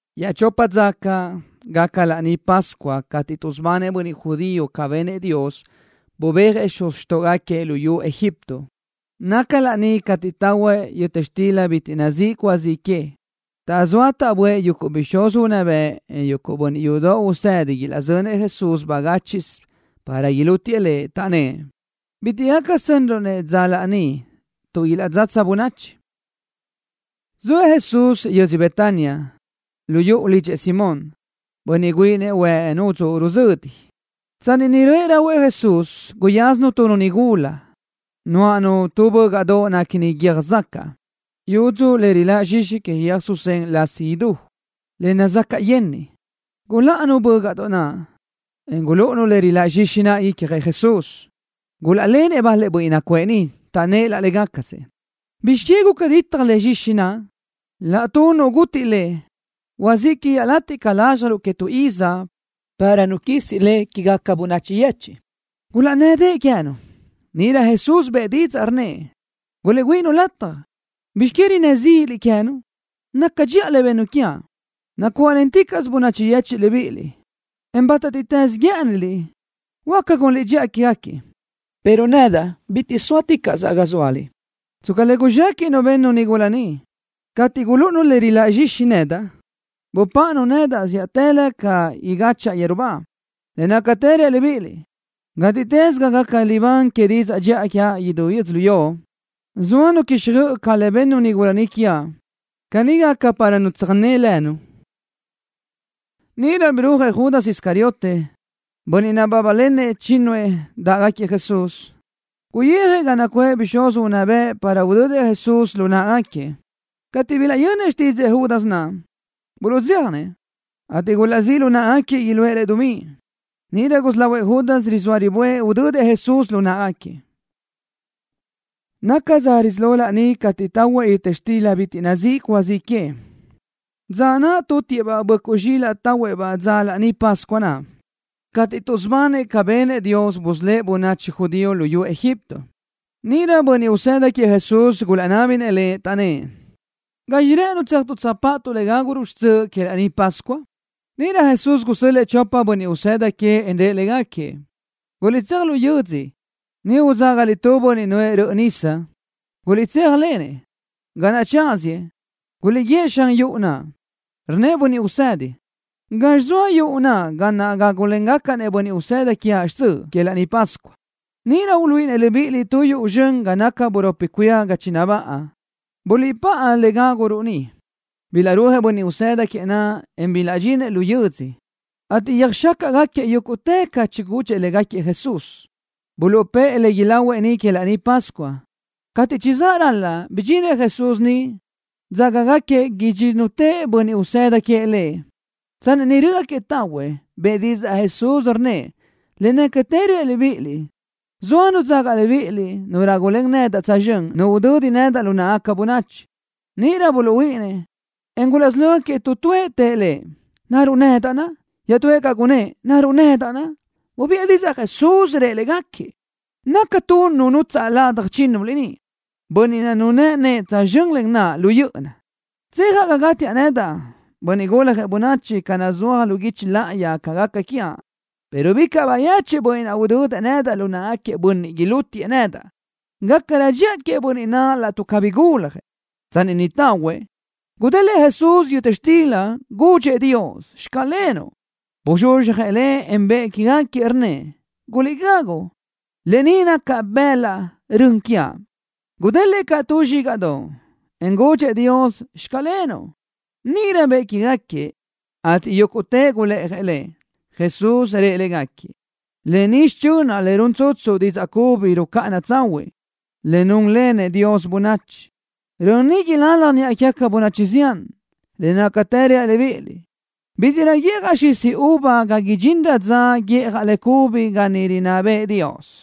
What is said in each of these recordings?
Iaʼchopa dza caʼ gaca Laní Pascua cateʼ tuʼsubanëʼ bönniʼ judío ca benëʼ Dios, bubéajëʼ xuz xtóʼogaquiëʼ luyú Egipto. Naca laní cateʼ tahuëʼ yöta xtila bitiʼ nazíʼ cúa zi que. Taʼzóa taʼböʼë yuguʼ bixúz unná bëʼ, en bönniʼ yudoʼ tuʼsë́dinëʼ ilaʼzönëʼ Jesús bagáchiʼsö para ilútiëʼ Lëʼ. Taʼnnë́ʼ: —Bitiʼ gaca sönruʼ-nëʼ dza laní tuʼ ilaʼtsatsa bönachi. Zoëʼ Jesús yödzö Betania, lu yuʼu lidxëʼ Simón, bönniʼ güíʼinëʼ huëʼ nudzuʼ ruzödi. Tsanni niʼ röʼë rahuëʼ Jesús, guyázanu tu nigula, nuáʼanu tu bö́gaʼdoʼ néquini guiö́j zacaʼ, yudzu le riláʼ zxixi que yöj susén lasi idú, le nazacaʼ yenniʼ. Guláʼanu bö́gaʼdoʼ naʼ, en gulúʼunu le riláʼ zxixi naʼ icjëʼ Jesús. Gulaʼlélanëʼ bal-lëʼ bönniʼ nacuʼë niʼ. Taʼnnë́ʼ laʼ légacasëʼ: —¿Bizx que guca ditaj le zxixi naʼ? Laʼtuʼ nu gutiʼ lë naʼ, huazíʼ que iaʼlatiʼ ca lázxjaruʼ que tu iz para nu quisi le quégaca bönachi yechiʼ. Gulaʼnnë́dëʼë queë́nu. Níʼirö Jesús bëʼë didzaʼ, rnnëʼ: —Guliʼgüíʼi-nu lataj. ¿Bizx que rinnë́ zíʼiliʼ queë́nu? Naca dxiʼa le bennu quiaʼ. Nacuáʼlenticaʼsö bönachi yechiʼ libíʼiliʼ, en bátatiʼtës guë́ʼëniliʼ, huáca gunliʼ dxiʼa quégaquiëʼ, pero nedaʼ bitiʼ sóaticaʼsaʼ ga zóaliʼ. Tsca le guzxéquiʼnu bennu nigula ni. Cateʼ gulúʼunu le riláʼ zxixi ni nedaʼ, bupáʼanu nedaʼ zíʼatëlö ca igáchaʼa yeru ba. Le nácatë reaʼ libíʼiliʼ, gátiʼtës ga gaca libán que didzaʼ dxiʼa quiaʼ idú yödzölió, soa nu quixjöʼ caʼ lë ni bennu nigula ni quiaʼ. Caní gaca para nu tsöjné lënu. Níʼirö birúajëʼ Judas Iscariote, bönniʼ nabábalenëʼ chínnuëʼ naʼ dáʼgaquiëʼ Jesús. Guyijëʼ ga nacuʼë bixúz unná bëʼ para udödëʼ Jesús lu náʼagaquiëʼ. Cateʼ bilaʼyönnëʼ xtídzëʼë Judas naʼ, buluʼdzéjanëʼ, ateʼ gulaʼzíʼ lu náʼagaquiëʼ iluʼë lëʼ dumí. Níʼirö gusí lahuëʼ Judas rizóa riböʼë udödëʼ Jesús lu náʼagaquiëʼ. Naca dza risí lo laní cateʼ tahuëʼ yöta xtila bitiʼ nazíʼi cúa zi que, dza naʼ tutiëʼ-baʼ böʼcuʼ zxílaʼdoʼ tahuëʼ-baʼ dzöʼ Laní Pascua naʼ, cateʼ tuʼsubanëʼ ca benëʼ Dios busölë́ʼ bönachi judío luyú Egipto. Níʼirö bönniʼ usëda queëʼ Jesús gulaʼnábinëʼ Lëʼ, taʼnnë́ʼ: —¿Gazxi rë́ʼënuʼ tséajtuʼ tsöjpáʼatuʼ le gáguruʼ xtsöʼ que Laní Pascua? Níʼirö Jesús gusö́l-lëʼë chopëʼ bönniʼ usëda queëʼ, en rëʼ légaquiëʼ: —Guliʼtséaj lu yödzö. Niʼ huadzágaliʼ tu bönniʼ nuʼë tu röʼö nisa. Guliʼtséajlenëʼ. Ga naʼ tsáziëʼ, guliʼguíëʼ xan yuʼu naʼ: “Rnnëʼ Bönniʼ Usedi: ¿Gazxi zoa yuʼu ga naʼ gágulengacaʼ-nëʼ bönniʼ usëda quiaʼ xtsöʼ que Laní Pascua?” Níʼirö uluíʼinëʼ libíʼiliʼ tu yuʼu zxön ga naca buropi cuía ga chinabáʼa. Buliʼpáʼa le gáguruʼ niʼ. Bilaʼrúajëʼ bönniʼ usëda queëʼ naʼ, en bilaʼdxinëʼ lu yödzö, ateʼ yöjxácaʼgaquiëʼ yúguʼtë ca naʼ chigudxëʼ légaquiëʼ Jesús. Buluʼpë́ʼë le ilahuëʼ niʼ que Laní Pascua. Cateʼ chizáʼ ral-la, bidxinëʼ Jesús niʼ, dzágagaquiëʼ idxínnutëʼ bönniʼ usëda queëʼ Lëʼ. Tsanni niʼ rö́ʼögaquiëʼ tahuëʼ, bëʼë didzaʼ Jesús, rnnëʼ: —Le nácatë reaʼ libíʼiliʼ, zoa nu dzaga libíʼiliʼ, nu rágulen nedaʼ tsözxö́n, nu udödi nedaʼ lu náʼagaca bönachi. Níʼirö buluʼhuíʼinnëʼ, en gulaʼsí lógaquiëʼ tu tuëʼ tëʼ Lëʼ: —¿Naruʼ nedaʼ? Iaʼtúëʼ caʼ gunnë́ʼ: —¿Naruʼ nedaʼ? Bubiʼë didzaʼ Jesús, rëʼ légaquiëʼ: —Naca tu nu nutsaʼ ladaj chínnuliʼ ni, bönniʼ naʼ nunë́ʼë nëʼë tsözxö́n len naʼa lu yö́ʼöna. Tsejaʼ ga gátiaʼ nedaʼ, Bönniʼ Guljëʼ Bönachi, ca naʼ nazúaj lu guichi láʼayi ca gaca quiaʼ, pero bicaʼ bayechiʼ bönniʼ naʼ udödëʼ nedaʼ lu náʼagaquiëʼ bönniʼ ilútiëʼ nedaʼ. Gácarö dxiʼa queëʼ bönniʼ naʼ laʼtuʼ cabí guljëʼ. Tsanni niʼ tahuëʼ, gudélëʼë Jesús yöta xtila. Gudxëʼ Dios: “Xclenuʼ.” Buzxuzxjëʼ le, en bëʼë quégaquiëʼ, rnnëʼ: —Guliʼgagu. Lë ni naca bëlaʼ rön quiaʼ. Gudélëʼë caʼ tu zxígaʼdoʼ, en gudxëʼ Dios: “Xclenuʼ.” Níʼirö bëʼë quégaquiëʼ, ateʼ yúguʼtëʼ gulë́ʼajëʼ le. Jesús rëʼ légaquiëʼ: —Lë ni xichönaʼ le run tsutsu didzaʼ cubi rucáʼana tsahuiʼ, le núnlenëʼ Dios bönachi. Rön ni ilalaj niʼa quégaca bönachi zián. Le nácatë reaʼ libíʼiliʼ, bítiʼrö guíʼjaʼ xisi uva ga idxinrö dza guíʼjaʼ le cubi ga niʼ rinná bëʼë Dios.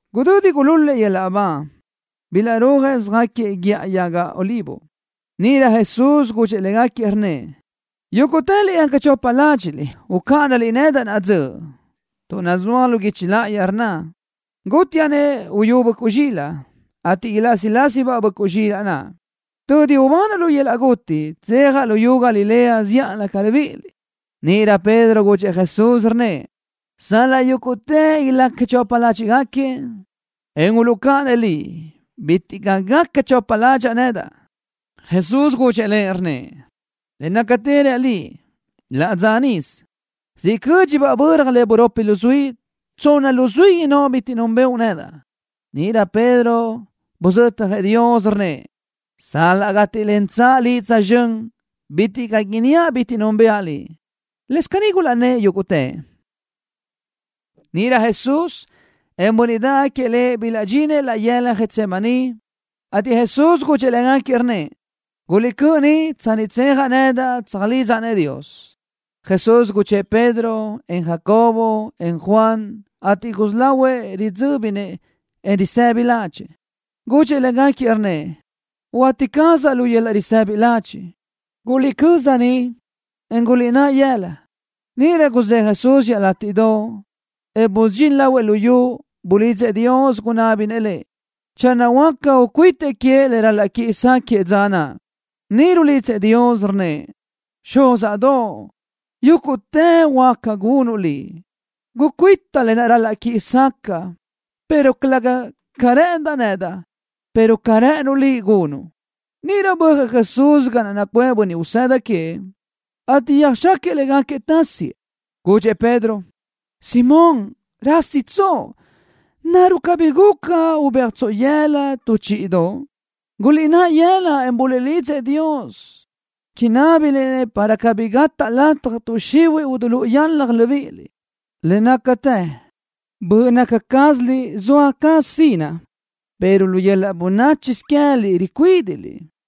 Gudödi gulúl-lëʼ yöl-laʼ ba, bilaʼrúajëʼ söjáquiëʼ Guíʼa Yaga Olivo. Níʼirö Jesús gudxëʼ légaquiëʼ, rnnëʼ: —Yúguʼtëliʼ gaca chopa ládxiʼliʼ, ucáʼanaliʼ nedaʼ naʼa dzöʼ, tuʼ nazúaj lu guichi láʼayi, rnna: “Gutiaʼ-nëʼ uyú böʼcuʼ zxilaʼ, ateʼ ilásilasibaʼ böʼcuʼ zxilaʼ naʼ.” Tödi ubanaʼ lu yöl-laʼ guti, tsejaʼ luyú Galilea zíʼalö ca libíʼiliʼ. Níʼirö Pedro gudxëʼ Jesús, rnnëʼ: —Sal-laʼ yúguʼtëʼ ilaca chopa ládxiʼgaquiëʼ, en uluʼcáʼanëʼ Liʼ, bitiʼ caʼ gaca chopa ládxaʼa nedaʼ. Jesús gudxëʼ lëʼ, rnnëʼ: —Le nácatë reaʼ liʼ, laʼ dzöʼ nisö, siʼ cö́dxilöbaʼ böra le buropi luzuí, tsonna luzuí innóʼ bitiʼ núnbëʼu nedaʼ. Níʼirö Pedro buzötjëʼ Dios, rnnëʼ: —Sal-laʼ gátilenteaʼ Liʼ tsözxö́n, bitiʼ caʼ inníaʼ bitiʼ núnbëʼa Liʼ. Lëscaʼ caní gulaʼnnë́ʼ yúguʼtëʼ. Níʼirö Jesús, en bönniʼ dáʼgaquiëʼ Lëʼ bilaʼdxinëʼ laʼ yëla Getsemaní, ateʼ Jesús gudxëʼ légaquiëʼ, rnnëʼ: —Guliʼcö́ʼ ni, tsanni tsejaʼ nedaʼ, tsöjlidzaʼ-nëʼ Dios. Jesús guchë́ʼë Pedro, en Jacobo, en Juan, ateʼ gusí lahuëʼ ridzö́binëʼ, en risëbi ládxëʼë. Gudxëʼ légaquiëʼ, rnnëʼ: —Huati cazaʼ lu yöl-laʼ risëbi ladxiʼ. Guliʼcö́z ni, en guliʼnáʼ yëla. Níʼirö guzë́ʼë Jesús iaʼlátiʼdoʼ, en busudxín lahuëʼ lu yu, bulidzëʼ Dios. Gunábinëʼ Lëʼ, channö huáca, ucuítëʼ queëʼ le ral-laʼ quiʼi sáquëʼë dza naʼ. Niʼ rulidzëʼ Dios, rnnëʼ: —Xúzaʼdoʼ, yúguʼtë huáca gunuʼ Liʼ. Gucuíta lë naʼ ral-laʼ quiʼi sacaʼa, pero calëga ca rë́ʼëndaʼ nedaʼ, pero ca rë́ʼënuʼ Liʼ, gunuʼ. Níʼirö bö́ajëʼ Jesús ga naʼ nacuʼë bönniʼ usëda queëʼ, ateʼ yöjxáquiëʼ légaquiëʼ tasiëʼ. Gudxëʼ Pedro: —Simón, ¿rásitsoʼ? ¿Naruʼ cabí rubéajtsoʼ yëla loʼ tu chíʼidoʼ? Guliʼnáʼ yëla, en buliʼlidzëʼ Dios, inábiliʼ-nëʼ para cabí gataʼ lataj tuʼ xihuiʼ idilúʼu yöl-laʼ libíʼiliʼ. Le nácatë böʼ naca cázaliʼ zoa caz sinaʼ, pero lu yöl-laʼ bönáchisö queë́liʼ ricuídiʼliʼ.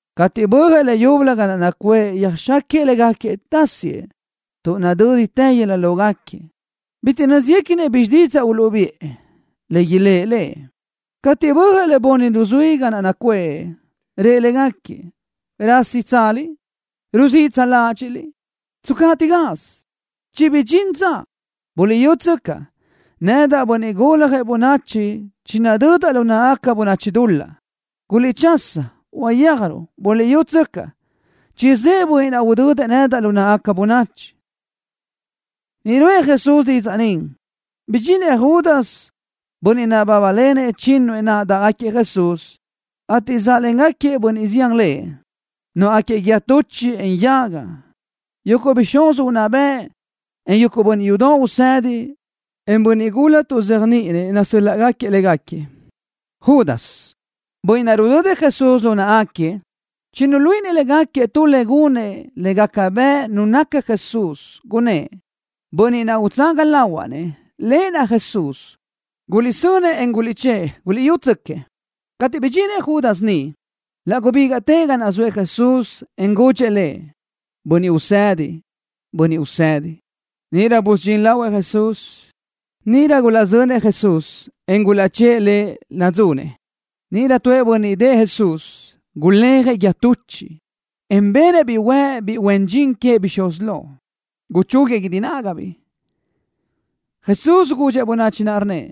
Cateʼ bö́ajëʼ leyúbölö ga naʼ nacuʼë, yöjxáquiëʼ légaquiëʼ tasiëʼ tuʼ nadö́ditë yëla lógaquiëʼ. Bitiʼ nö́zguequinëʼ bizxi didzaʼ uluʼbiʼë, le ilë́ʼ Lëʼ. Cateʼ bö́ajëʼ le bunni luzuí ga naʼ nacuʼë, rëʼ légaquiëʼ: —¿Rásitsaliʼ? ¿Ruziʼtsa ládxiʼliʼ? ¡Tscaʼtiʼ gaz! ¡Chibidxín dza! ¡Buliʼyútsöcaʼ, Nedaʼ, Bönniʼ Guljëʼ Bönachi, chinadödaʼ lu náʼagaca bönachi dul-laʼ! ¡Guliʼchasa, uyéajruʼ! ¡Buliʼyútsöcaʼ, chizë́ʼë bönniʼ naʼ udödëʼ nedaʼ lu náʼagaca bönachi! Niʼ ruʼë Jesús didzaʼ ni, bidxinëʼ Judas, bönniʼ nabábalenëʼ chínnuëʼ naʼ dáʼgaquiëʼ Jesús, ateʼ záʼlengaquiëʼ bönniʼ zián lëʼ, nuáʼagaquiëʼ guíë tuchiʼ, en yaga. Yuguʼ bixúz unná bëʼ, en yuguʼ bönniʼ yudoʼ usedi, en bönniʼ gula tuʼzéajniʼinëʼ nasö́l-laʼgaquiëʼ légaquiëʼ. Judas, bönniʼ naʼ rudödëʼ Jesús lu náʼagaquiëʼ chinuluíʼinëʼ légaquiëʼ tu le gunëʼ le gaca bëʼ nu naca Jesús, gunnë́ʼ: —Bönniʼ naʼ utsaga lahuaʼ-nëʼ, Lëʼ naʼ Jesús. ¡Guliʼsönëʼ, en guliʼchë́ʼë! ¡Guliʼyútsöquiëʼ! Cateʼ bidxinëʼ Judas niʼ, laʼ gubígaʼtëʼ ga naʼ zoëʼ Jesús, en gudxëʼ Lëʼ: —Bönniʼ Usedi, Bönniʼ Usedi. Níʼirö busudxín lahuëʼ Jesús. Níʼirö gulaʼzönëʼ Jesús, en gulaʼchë́ʼë Lëʼ nadzunëʼ. Níʼirö tuëʼ bönniʼ niʼ dëʼë Jesús guléajëʼ guíë tuchiʼ, en benëʼ-biʼ huëʼ biʼi huen dxin queëʼ bixúz lo. Guchúguiëʼ guídi nágabiʼ. Jesús gudxëʼ bönachi naʼ, rnnëʼ: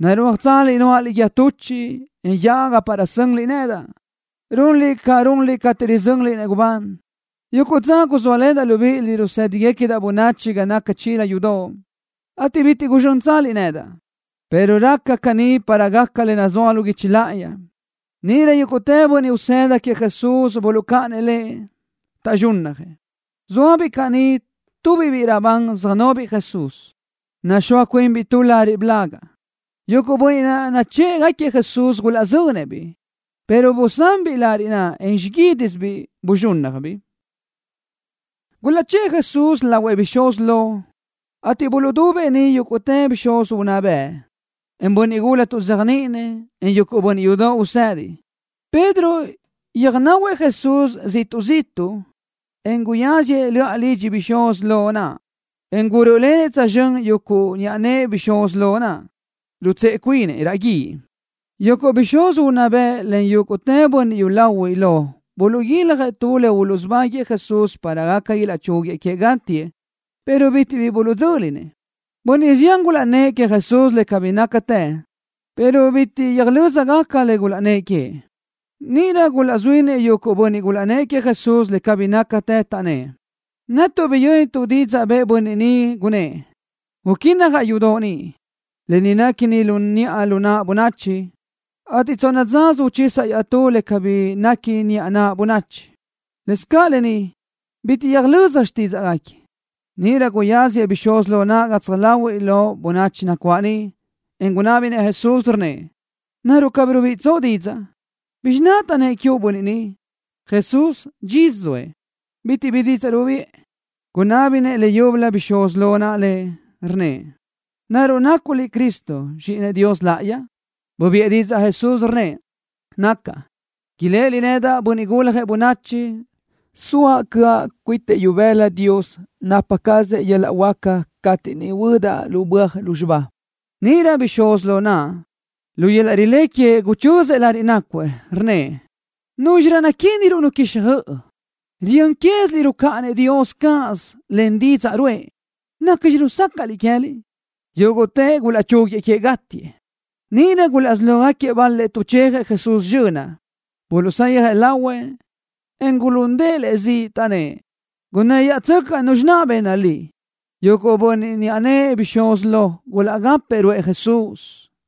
—¿Narúajtsaliʼ nuáʼaliʼ guíë tuchiʼ, en yaga para sönliʼ nedaʼ, runliʼ ca runliʼ cateʼ rizönliʼ-nëʼ gubán? Yuguʼ dza guzóalenaʼ libíʼiliʼ rusë́digacadaʼ bönachi ga naca chila yudoʼ, ateʼ bitiʼ guzxönliʼ nedaʼ, pero raca caní para gaca le nazúaj lu guichi láʼayi. Níʼirö yúguʼtë bönniʼ usëda queëʼ Jesús buluʼcáʼanëʼ Leʼ, taʼzxúnnajëʼ. Zóabiʼ caʼ niʼ tubiʼ biʼi raʼbán söjnobiʼ Jesús, nuxóasö cuinbiʼ tu lariʼ blagaʼ. Yuguʼ bönniʼ naʼ nachë́ʼgaquiëʼ Jesús gulaʼzönëʼ-biʼ pero busanbiʼ lariʼ naʼ, en xiguídisöbiʼ buzxúnnajbiʼ. Gulaʼchë́ʼë Jesús lahuëʼ bixúz lo, ateʼ buluʼdubëʼ niʼ yúguʼtë bixúz unná bëʼ, en bönniʼ gula tuʼzéajniʼinëʼ, en yuguʼ bönniʼ yudoʼ usedi. Pedro yöjnahuëʼ Jesús ziʼtuʼ zíʼtuʼsö, en guyáziëʼ löʼa lidxi bixúz lo naʼ, en gurö́ʼölenëʼ tsözxö́n yuguʼ niʼa nëʼë bixúz lo naʼ, rutsëʼe cuinëʼ raʼ guíʼ. Yuguʼ bixúz unná bëʼ len yúguʼtë bönniʼ yúlahuiʼ lo buluʼguiljëʼ tu le uluʼsubáguiëʼ Jesús para gaca ilaʼchúguiëʼ queëʼ gátiëʼ pero bitiʼ bi buluʼdzö́linëʼ. Bönniʼ zián gulaʼnnë́ʼ queëʼ Jesús le cabí nácatë, pero bitiʼ yöjlö́zagaca le gulaʼnnë́ʼ queëʼ. Níʼirö gulaʼzuínëʼ yuguʼ bönniʼ gulaʼnnë́ʼ queëʼ Jesús le cabí nácatë, taʼnnë́ʼ: —Netuʼ biyö́nituʼ didzaʼ bëʼë bönniʼ ni, gunnë́ʼ: “Uquínnajaʼ yudoʼ ni, lë ni nequi lu niʼa lu naʼ bönachi, ateʼ tsonna dzasö uchisaʼ iaʼtú le cabí nequi lu niʼa lu naʼ bönachi.” Lëscaʼ lë ni, bitiʼ yöjlö́zagaca xtídzaʼgaquiëʼ. Níʼirö guyasëʼ bixúz lo naʼ gatsaj láhuiʼlö bönachi nacuáʼ niʼ, en gunábinëʼ Jesús, rnnëʼ: —¿Naruʼ cabí rubiʼitsoʼ didzaʼ? ¿Bizxi naʼ taʼnnë́ʼ quiuʼ bönniʼ ni? Jesús, dxisö zoëʼ. Bitiʼ bi didzaʼ rubiʼë. Gunábinëʼ Lëʼ leyúbölö bixúz lo naʼ, rnnëʼ: —¿Naruʼ nacuʼ Liʼ Cristo, Zxíʼinëʼ Dios Láʼayi? Bubiʼë didzaʼ Jesús, rnnëʼ: —Nacaʼ. Iléʼeliʼ nedaʼ, Bönniʼ Guljëʼ Bönachi, soaʼ cöʼa cuitëʼ ibëla Dios napa cazëʼ yöl-laʼ huáca cateʼ niʼ huödaʼ lu böaj lúzxiba. Níʼirö bixúz lo naʼ, lu yöl-laʼ rilé queëʼ guchözëʼ lariʼ nácuëʼ, rnnëʼ: —¿Núzxirö naquíniruʼ nu quixjöʼ? ¡Riyö́n quéziliʼ rucáʼanëʼ Dios cáʼasö len didzaʼ ruʼë! ¿Nacxi rusácaʼliʼ queë́liʼ? Yúguʼtëʼ gulaʼchúguiëʼ queëʼ gátiëʼ. Níʼirö gulaʼsí lógaquiëʼ bal-lëʼ tuʼchejëʼ Jesús zxönaʼ. Buluʼsayjëʼ lahuëʼ, en gulundëʼ Lëʼ ziʼ, taʼnnë́ʼ: —Gunnë́ yáʼatsöcaʼ nuzxi naʼ bëʼ Liʼ. Yuguʼ bönniʼ niʼa nëʼë bixúz lo gulaʼgápëʼë ruʼë Jesús.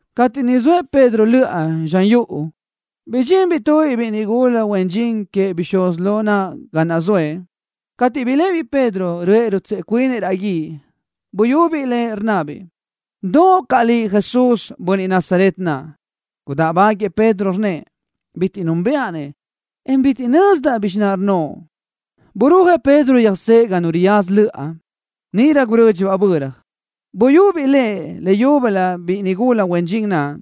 Cateʼ niʼ zoëʼ Pedro löʼa zxan yuʼu, bidxinbiʼ tubiʼ biʼi nigula huen dxin queëʼ bixúz lo naʼ ga naʼ zoëʼ. Cateʼ biléʼebiʼ Pedro, röʼë rutsëʼe cuinëʼ raʼ guíʼ, buyubiʼ lëʼ, rnnabiʼ: —Doʼo caʼ liʼ Jesús, bönniʼ Nazaret naʼ. Gudáʼbaguiëʼ Pedro, rnnëʼ: —Bitiʼ núnbëʼa-nëʼ, en bitiʼ nözdaʼ bizxi naʼ rnnoʼ. Burúajëʼ Pedro yöjsóëʼ ga nu riyaza löʼa. Níʼirö gurö́dxibaʼ böra. Buyubiʼ lëʼ leyúbölö biʼi nigula huen dxin naʼ,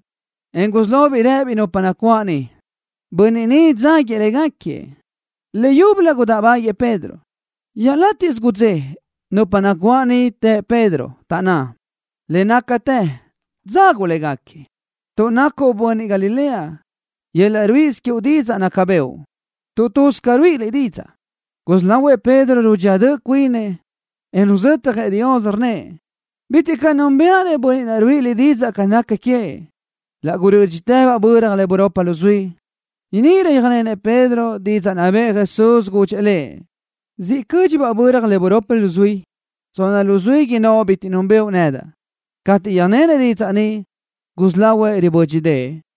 en gusí lobiʼ rëbiʼ nupa nacuáʼ niʼ: —Bönniʼ ni dzáguiëʼ légaquiëʼ. Leyúbölö gudáʼbaguiëʼ Pedro. Iaʼlatiʼ gudzé nupa nacuáʼ niʼ të Pedro, taʼnná: —Le nácatë dzaguʼ légaquiëʼ, tuʼ nacuʼ bönniʼ Galilea. Yöl-laʼ ruíʼisö quiuʼ didzaʼ naca bëʼu, tuʼ tuz ca ruíʼiliʼ didzaʼ. Gusí lahuëʼ Pedro rudxía döʼ cuinëʼ, en ruzötjëʼ Dios, rnnëʼ: —Bitiʼ caʼ núnbëʼa-nëʼ bönniʼ naʼ ruíʼiliʼ didzaʼ ca naca queëʼ. Laʼ gurö́dxitëbaʼ böra le buropi luzuí. Níʼirö yöjnenëʼ Pedro didzaʼ naʼ bëʼë Jesús, gudxëʼ lëʼ: “Ziʼalö cö́dxibaʼ böra le buropi luzuí, tsonna luzuí innóʼ bitiʼ núnbëʼu nedaʼ.” Cateʼ yöjnenëʼ didzaʼ ni, gusí lahuëʼ ribö́dxidëʼë.